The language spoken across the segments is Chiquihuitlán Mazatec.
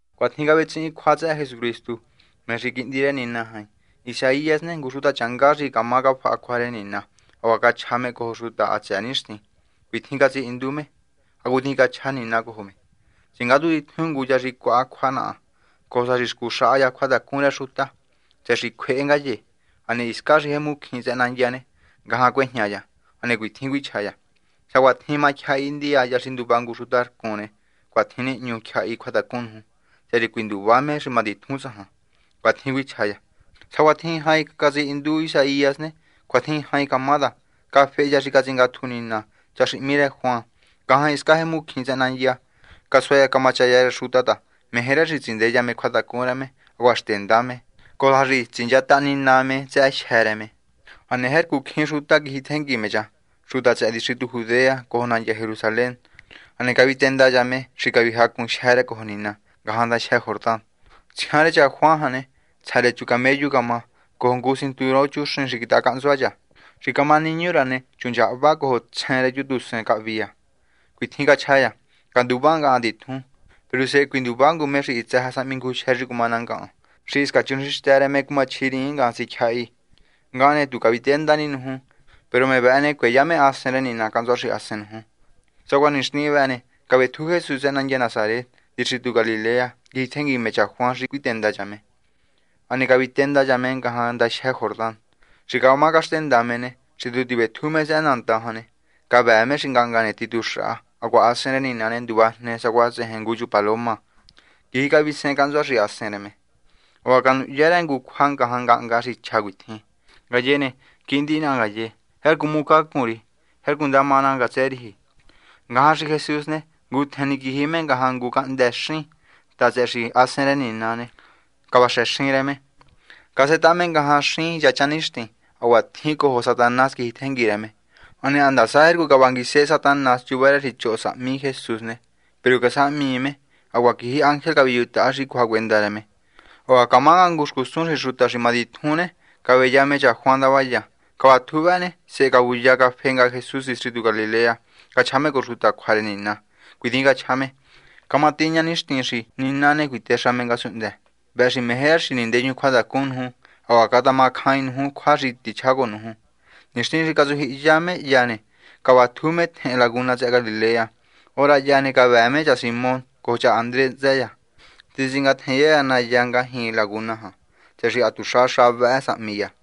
Cuitjin cavetsihin cjua tsëhë Jesucristu, me xi Quihndi rë Nina Jain. Isaías ne, ngu xutachanga xi cama cafaha cjua rë Nina hacuaha cachja me cojo xuta hatsëë nixtin. Cuitjin catsihindu me, hacutjin cachja Nina cojo me: Tsingátju titjun ngu cha xi cjuaha cjua naha, cojo sa xi scuxaha cha cjuatacun rë xuta, tsëhë xi cjuehe ngaye. Hane hiscan jemu xín tsëhë nandya ne, ngajan cuejña cha. Hane cuitjin cuichja cha: “Sacuatjin matyjahi ndiya hya xi nduva ngu xuta rcun ne, cuatjin nihñu tyjahi cjuatacun nuju tsëhë xi cuinduva me xi matitjun tsajan.” Cuatjin cuichja cha. Sacuatjin jain catsihindu Isaías ne, cuatjin jain camá ta cafehe cha xi catsingatju Nina, cha xi hmí rë Juan, ngajan hiscan jemu xín tsëhë nandya. Casua cha camachaya rë xuta ta meje rë xi tsindeya me cjuatacun rë me hacuaha xtenda me, cojo sa xi tsinchataha Nina me tsëhë jyë́ rë me. Hane jercu cjín xuta quijitjengui me cha, xuta tsëhë distritu Judea cojo nandya Jerusalén. Hane cavitenda cha me xi cavijacun jyë́ rë cojo Nina ngajan ndajyë Jordán. Tsjian rë cha Juan jan ne, tsja rë chu camellu camá. Cojo ngu cinturón chuxin quitaha cahntsua cha. Xi camá niñu rë cha ne, chu nchahva. Cojo tsjen rë chu tusen cahvi cha. Cuitjin cachja cha: ―Canduvá ngahan titjun. Peru sehe cuinduva ngu me xi hitsë sa vechu cjuatacun rë xi cumá ná ngahan, xi hisca chuxinxtë rë me cumaji tsinguisehercu sahme tyjahi. Ngahan ne, tu caviténda ni nuju. Peru me vëhë ne, cueya me Hasen rë Nina cahntsua xahasen nuju. Sacuaha nixtin vëhë ne, cavetju Jesús tsëhë nandya Nasaret, distritu Galilea. Quijitjengui me cha Juan xi cuitenda cha me. Hane cavitenda cha me ngajan ndajyë Jordán. Xi camá caxtenda me ne, xi tu tivetju me tsëhë nandan jan ne, cavëë me xi ngahnga ne tituxaha, hacuaha Hasen rë Nina ne, nduvajne sacuaha tsejen ngu paloma, quiji cavisehen cahntsua xahasen rë me. Hacuaha canuhya rë ngu cjua ngajan ngahnga xi chja cuitjin: ―Ngaye ne, quihndi naha ngaye. Jercu hmucacun ri. Jercu ndama ná ngatsë riji. Ngajan xi Jesús ne, ngutjen ni quiji me ngajan ngu xín ta tsëhë xi Hasen rë Nina ne, cavaxëxin rë me. Casetaha me ngajan xín yachan nixtin. Hacuatjin cojo Satanás quijitjengui rë me. Hane handasa jercu cavangui Satanás chuva rë xi choho sahmi Jesús ne, peru casahmii me. Hacuaha quiji ángel caviyujutaha xi cjuahacuenda rë me. Hacuaha camá nga ngu xcusun xi xuta xi matitjun ne, caveya me cha Juan ndavaya. Cavatju vëhë ne, sehe cavuya cafe nga Jesús distritu Galilea, cachja me cojo xuta cjua rë Nina. Cuitjin cachja me: ―Camatiña nixtin xi Nina ne, cuitexa me ngasunhndë. Vëhë xi meje rë xi nindeyun cjuatacun nuju hacuaha catamacjain nuju cjua xi tichjá cojo nuju. Nixtin xi catsujyihiya me hya ne, cavatju me tjehen laguna tsëhë Galilea. Hora hya ne, cavëë me cha Simón cojo cha Andrés hntsë cha. Titsingatjenya cha nahya ngajñi laguna jan, tsëhë xi ha tuxa xa vëhë sahmi cha.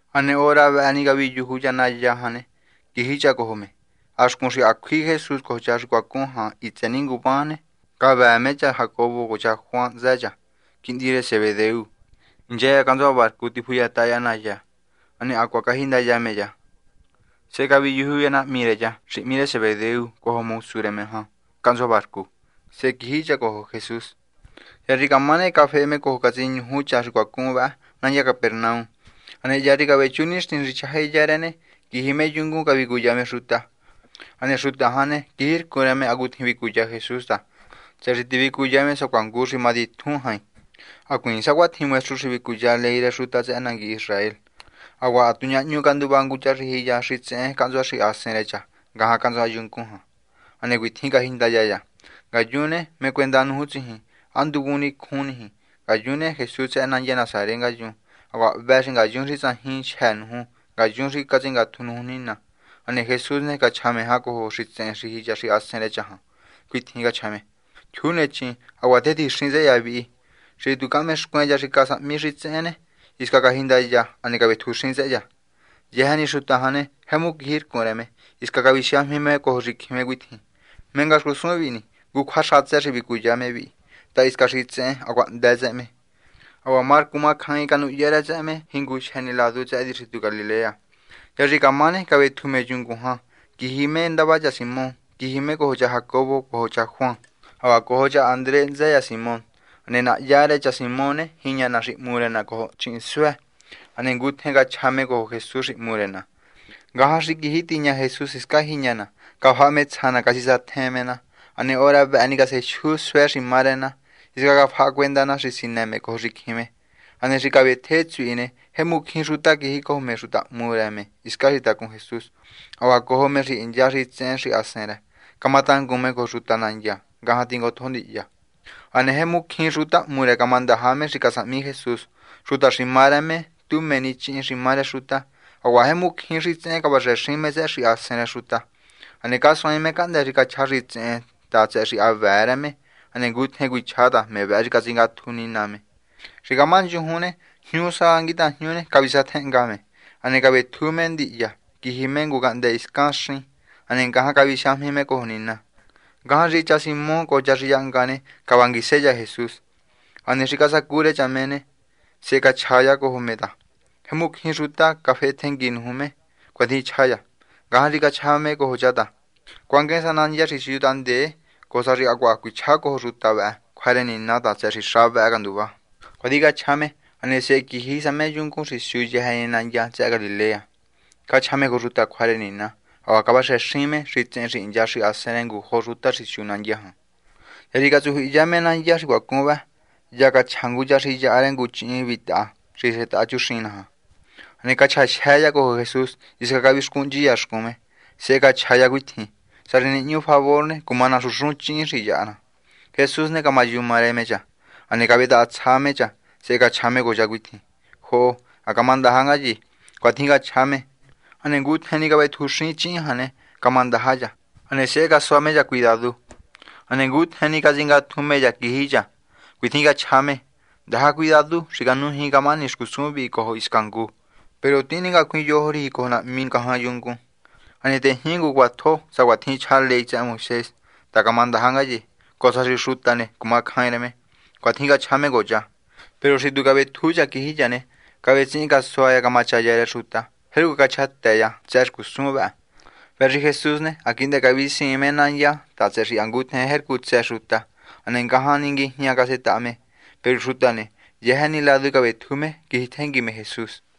Hane hora vëhë ni caviyuju cha nahya jan ne, quiji cha cojo me. Ha xcun xi ha cjui Jesús cojo cha xi cuacun jan hitsë ni nguvan ne, cavëë me cha Jacobo cojo cha Juan hntsë cha, quihndi rë Zebedeo. Hincha cha cahntsua barcu, tifuyataha cha nahya. Hane hacuaha cajindaya me cha. Sehe caviyuju cha nahmi rë cha xi hmí Zebedeo cojo mosu rë me ngajan cahntsua barcu. Sehe quiji cha cojo Jesús. Hya xi camá ne, cafehe me cojo catsiñuju cha xi cuacun vëhë nandya Capernaum. Hane hya xi cavechu nixtin xi chjahájenda rë ne, quiji me yungun, cavicuya me xuta. Hane xuta jan ne, quijircun rë me hacutjin vicuya Jesús ta, tsëhë xi tivicuya me sacuaha ngu xi matitjun jain, hacuiin sacuatjin maestru xi vicuya ley rë xuta tsëhë nangui Israel. Hacuaha ha tu ñahñu canduva ngu cha xi jiya xitsehen cahntsua xahasen rë cha ngajan cahntsua yungun jan. Hane cuitjin cajindaya cha: ―Ngayun ne, ¿mé cuenda nuju tsijin? ¿Há nduvun nicjun niji? Ngayun ne, Jesús tsëhë nandya Nasaret ngayun. Hacuaha hvë xi ngayun xi tsajin jyë́ nuju ngayun xi catsingatju nuju Nina. Hane Jesús ne, cachja cjan me cojo xitsehen xi jiya xahasen rë cha jan. Cuitjin cachja me: ―Jyuu nechin. Hacuaha tetjixin tsëhë cha vi. Xi tu cahmexcuen cha xi casahmi xitsehen ne, hisca cajindaya, hane cavetjuxin tsëhë cha. Yëjë ni xuta jan ne, jemu quijircun rë me, hisca cavisiajmi me cojo xicjin me cuitjin: ―¿Mé nga xcusun vihi ni? Ngu cjua xatsë xi vicuya me vihi, ta hisca xitsehen, hacuaha hndë tsëhë me. Hacuaha marcu macjain canuhya rë tsëhë me jinguyëjë ni ladu tsëhë distritu Galilea. Hya xi camá ne, cavetju me yungun jan, quiji me ndava cha Simón. Quiji me cojo cha Jacobo cojo cha Juan, hacuaha cojo cha Andrés hntsë cha Simón. Hane nahya rë cha Simón ne, jiña na xi hmu rë na cojo chihinsuë. Hane ngutjen cachja cha cojo Jesús xi hmu rë na. Ngajan xi quiji tiña Jesús hiscan jiña na, cafaha me tsja na, catsisatjen me na. Hane hora vëhë ni, casejyu suë xi má rë na. Hisca cafaha cuenda na xi sinë me cojo xicjin me. Hane xi cavetje tsuhi ne, jemu cjín xuta quijicojo me xuta hmu rë hiscan tacun Jesús, hacuaha cojo me xi hincha xitsehen xahasen rë, camatangun me cojo xuta nandya ngajan tingotjo ndihya. Hane jemu cjín xuta hmu rë camandaja me xi casahmi Jesús, xuta xi má rë me tu mé ni chíhin xi má rë xuta. Hacuaha jemu cjín xitsehen cavaxëxin me tsëhë xahasen rë xuta. Hane casuaain me cahndë́ xi cachja xitsehen ta tsëhë xi ha vëë rë me. Hane ngutjen cuichja ta me vëhë xi catsingatju Nina me. Xi camá nchujuni, jñu sa nguitajñu cavisatjenhnga me. Hane cavetju me ndihya quiji me ngu cahndë́ hiscan xin. Hane ngajan cavisiajmi me cojo Nina. Ngajan xi cha Simón cojo cha xi yahnga jan ne, cavanguise cha Jesús. Hane xi casacu rë cha me ne, sehe cachja cha cojo me ta: ―Jemu cjín xuta cafehetjengui nuju me. ―Cuatjin chja cha. Ngajan xi cachja me cojo cha ta: ―Cuanguen sa nandya xi siu tahndee, cojo sa xi hacuaha cuichjá cojo xuta vëhë cjua rë Nina ta tsëhë xi xa vëhë canduvá. ―Cuatjin cachja me. Hane sehe quiji sa me yungun xi siu yëjë ni nandya tsëhë Galilea. Cachja me cojo xuta cjua rë Nina, hacuaha cavaxëxin me xitsehen xi hincha xahasen rë ngujo xuta xi siu nandya jan. Hya xi catsujyihiya me nandya xi cuacun vëhë, hya cachja ngu cha xi yaha rë ngu chíhin vitaha xi setaha chuxin naja. Hane cachjajyë cha cojo Jesús, hisca cavixcuhnchi cha xcun me, sehe cachja cha cuitjin: ―Sá xi nihñu favor ne, cuma naxunxun chíhin xi yaha ná. Jesús ne, camayuma rë me cha. Hane cavetahatsja me cha. Sehe cachja me cojo cha cuitjin: ―Joho. Ha camandaja ngaye. ―Cuatjin cachja me. Hane ngutjen ni cavetjuxin chíhin jan ne, camandaja cha. Hane sehe casua me cha cuidadu. Hane ngutjen ni catsingatju me cha, quiji cha. Cuitjin cachja me: ―Ndaja cuidadu xi canujiin camahani xcusun vi cojo hisca ngu. Peru tihin ningacuin yojo riji cojo nahmi ngajan yungun. Hane tejñi ngu cjuatjo sacuatjin chja ley tsëhë Moisés ta camandaja ngaye, cojo sa xi xuta ne, cumacjain rë me. ―Cuatjin cachja me cojo cha. Peru xi cavetju cha quiji cha ne, cavetsihin casua cha camachaya rë xuta. Jercu cachjatë cha tsëhë xcusun vëhë. Vëhë xi Jesús ne, ha quihndë cavisiin me nandya ta tsëhë xi ha ngutjen jercu tsë xuta. Hane ngajan ni nguijña casetaha me. Peru xuta ne, yëjë ni ladu cavetju me, quijitjengui me Jesús.